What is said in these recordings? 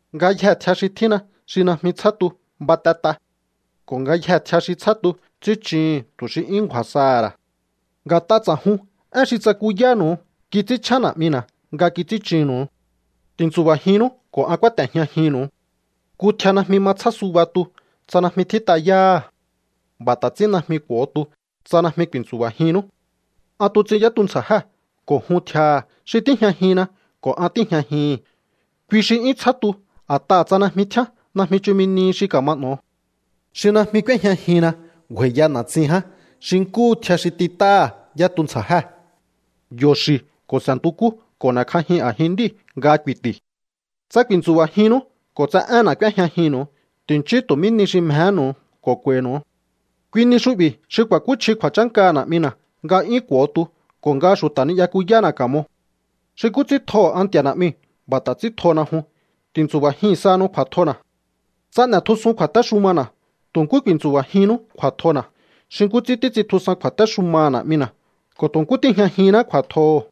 Ngayjee̱ tjia xi tjínna xi najmi tsjá tu, batet'a. Ko̱ ngayjee̱ tjia xi tsjá tu, ts'ín chuhu̱n tu̱ xi 'yún ngju̱a̱ saha̱ ra̱. Nga̱t'a ts'a̱jun, én xi tsakuyánu̱u kits'ínchjén Na̱'mina̱ nga kits'ín chunnu̱u. Ti̱ntsu̱ba̱jinnú ko̱ an kúáte̱jñajinnu̱u. Nku tjia najmi ma tsjá suba tu tsa najmi tjít'a yáha̱. B'a̱ ta̱ ts'ín najmi k'u̱o tu tsa najmi ku̱i̱ntsu̱ba̱jinnú. ’An tuts'in yá tuntsja̱jée̱ ko̱ jun tjiaha̱. Xi tíjñajinna ko̱ an tíi̱jñajihi̱n, kui xi 'yún tsjá tu. A̱t'aha̱ tsa najmi tjíán, najmi chumi nihi xi ka̱ma n'o̱o. Xi najmi k'úéjñajinna ngju̱a̱i̱ya na̱tsin ján xi nkúhu tjia xi tit'áha̱ yá tuntsja̱jée̱. Yo̱ xi̱ ko̱ s'e̱ntukú ko̱ n'e̱kj'ajin a̱jin nd'íu̱ nga ku̱i̱ti̱. ’Tsa ku̱i̱ntsu̱ba̱jinnú ko̱ tsa énna̱ k'úéjñajinnu̱u, ti̱nchíú tu̱ mí ni xi mjehénu̱u ko̱ k'u̱a̱i̱nu̱u. Kui ni xu'bi̱ xi ku̱a̱kúchji kju̱a̱chánkaha̱ Na̱'mina̱, nga 'yún k'u̱o tu ko̱ nga xu̱ta̱ ni'yakuyána̱ ka̱mo. Xi nkú ts'ín tjoho̱ an Nti̱a̱ Na̱'miu̱, b'a̱ ta̱ ts'ín tjona jun. Ti̱ntsu̱ba̱jin sahanu kju̱a̱tjona̱. Tsa n'e̱tjusun kju̱a̱téxumana̱, tu̱ nkú ku̱i̱tsu̱ba̱jinnú kju̱a̱tjona̱, xi nkú ts'ín títs'intjusan kju̱a̱téxumaha̱ Na̱'mina̱ ko̱ tu̱ nkú tíi̱jñajinná kju̱a̱tjoho̱.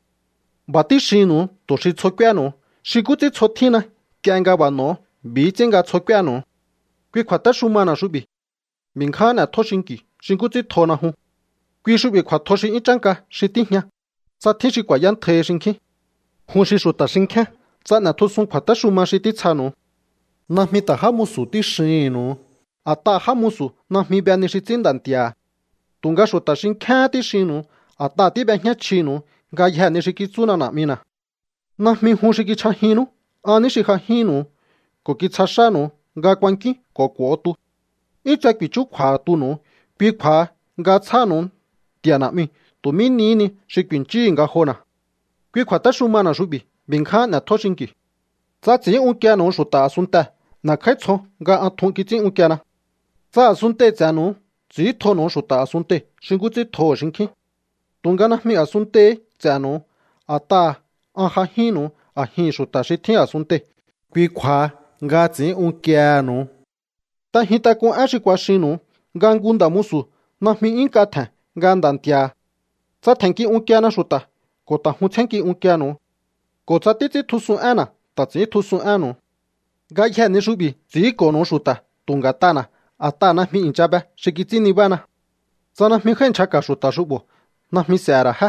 ’B'a̱ tíxinnu̱u tu̱ xi tsjo k'úéhe̱nu̱u xi nkú ts'ín tsjo tjínna. Nk'ie nga b'a̱ n'o̱o, b'i̱hí ts'ín nga tsjo k'úénu̱u. Kui kju̱a̱téxumana̱ xu'bi̱: B'i̱ ngján n'e̱tjó xinki̱u xi nkú ts'ín tjona jun. Kui xu'bi̱ kju̱a̱tjo xi 'yún chánka xi tíjña, tsa tjín xi ku̱a̱yántjaihi xinkjín. Jun xi xu̱ta̱ xinkjíán tsa n'e̱tjusun kju̱a̱téxuma xi títsjanu̱u. Najmi ta̱ já musu̱ tíxihi̱nnu̱u, a̱t'aha̱ já musu̱ najmi be ni xi ts'ín nda̱ nti̱a̱ha̱. Tu̱nga xu̱ta̱ xinkjíáhán tíxinnu̱u, a̱t'aha̱ tíb'ejñá chjinu̱u ngayjee̱ ni xi kitsúna Na̱'mina̱. ’Najmi jun xi kichj'ajinnú. An ní xi j'ajínnu̱u ko̱ kitsja xánu̱u nga kuankíún ko̱ k'u̱o tu. 'Yún tse ku̱i̱chúkju̱a̱ha̱ tunu̱u. Kui kju̱a̱ha nga tsjáha̱nu̱u Nti̱a̱ Na̱'miu̱ tu̱ mí nihí ni xi ku̱i̱nchíhu̱u ngajona̱. Kui kju̱a̱téxumana̱ xu'bi̱: B'i̱ ngján n'e̱tjó xinki̱u. ’Tsa ts'i̱ín unkienu̱u xu̱ta̱ a̱sunntee̱, n'e̱kj'áítsjon nga an tjun kits'ín unkiena. Tsa a̱sunntei̱ ts'e̱nu̱u, ts'i̱íntjonu̱u xu̱ta̱ a̱sunntei̱ xi nkú ts'ín tjoho̱ xinkjín. Tu̱nga najmi a̱sunntei̱hí ts'e̱nu̱u, a̱t'aha̱ an j'ajínnu̱u a̱jihi̱n xu̱ta̱ xi tjín a̱sunntei̱. Kui kju̱a̱ha nga ts'i̱ín unkiehe̱nu̱u. ’T'ejin tak'un én xi kuaxinnu̱u, nga nku nda̱ musu̱ najmi 'yún nk'a tje̱n nga nda̱ nti̱a̱ha̱. Tsa tje̱nnki unkiena xu̱ta̱, ko̱ ta̱ jun tsjénnki unkienu̱u. Ko̱ tsa títs'íntjusun énna̱, ta̱ ts'i̱íntjusun énnu̱u. Ngayjee̱ ni xu'bi̱ ts'i̱ínko̱nu̱u xu̱ta̱ tu̱ nga̱t'ana̱, a̱t'aha̱ najmi i̱ncha be xi kits'ín nibána. ’Tsa najmi jái̱ nchjaka̱ xu̱ta̱ xu'bo̱, najmi s'e̱he̱ ra̱ jé.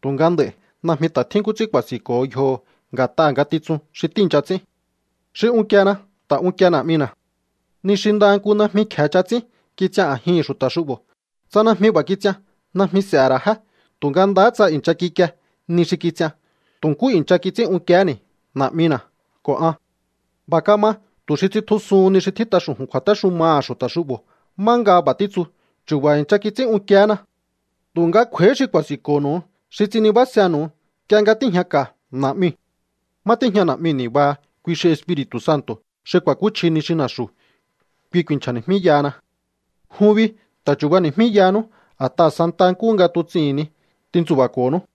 Tu̱nga nd'a̱i̱ najmi ta̱ tjín nkú ts'ín ku̱a̱si̱nko̱ho yjoho̱ nga̱t'aha̱ ngatitsun xi tíi̱ncha ts'ín. Xi unkiena ta̱ unkie Na̱'mina̱. Ni xi ndaha nku najmi kje̱e ch'aha ts'ín kits'ian a̱jihi̱n xu̱ta̱ xu'bo̱. Tsa najmi b'a̱ kits'ian, najmi s'e̱he̱ ra̱ jé. Tu̱nga ndaha tsa i̱ncha kikie ni xi kits'ian, tu̱ nkú i̱ncha kits'ín unkiehéni̱ Na̱'mina̱ ko̱ an. B'a̱ kama tu̱ xi tsitjusuhun ni xi tjít'a xu̱ju̱n kju̱a̱téxumaha̱ xu̱ta̱ xu'bo̱ má nga b'a̱ títsu: “Chu̱ba̱ i̱ncha kits'ín unkiehéna.” ’Tu̱nga kj'u̱a̱íhí xi ku̱a̱si̱nko̱nu̱u, xi ts'in nibásenu̱u nk'ie nga tíi̱jñaka̱ Na̱'miu̱. Má tíjña Na̱'miu̱ ni̱baha. Kui xi Espiri̱tu̱ Santo̱ xi ku̱a̱kúchji ni xi na̱xu̱. Kui ku̱i̱nchja̱ni̱jmíyahana. Jun bi ta̱ chu̱bani̱jmíyahanú, a̱t'aha̱ santaha nkúhu nga tuts'ihi̱n ni tintsu̱ba̱ko̱nú.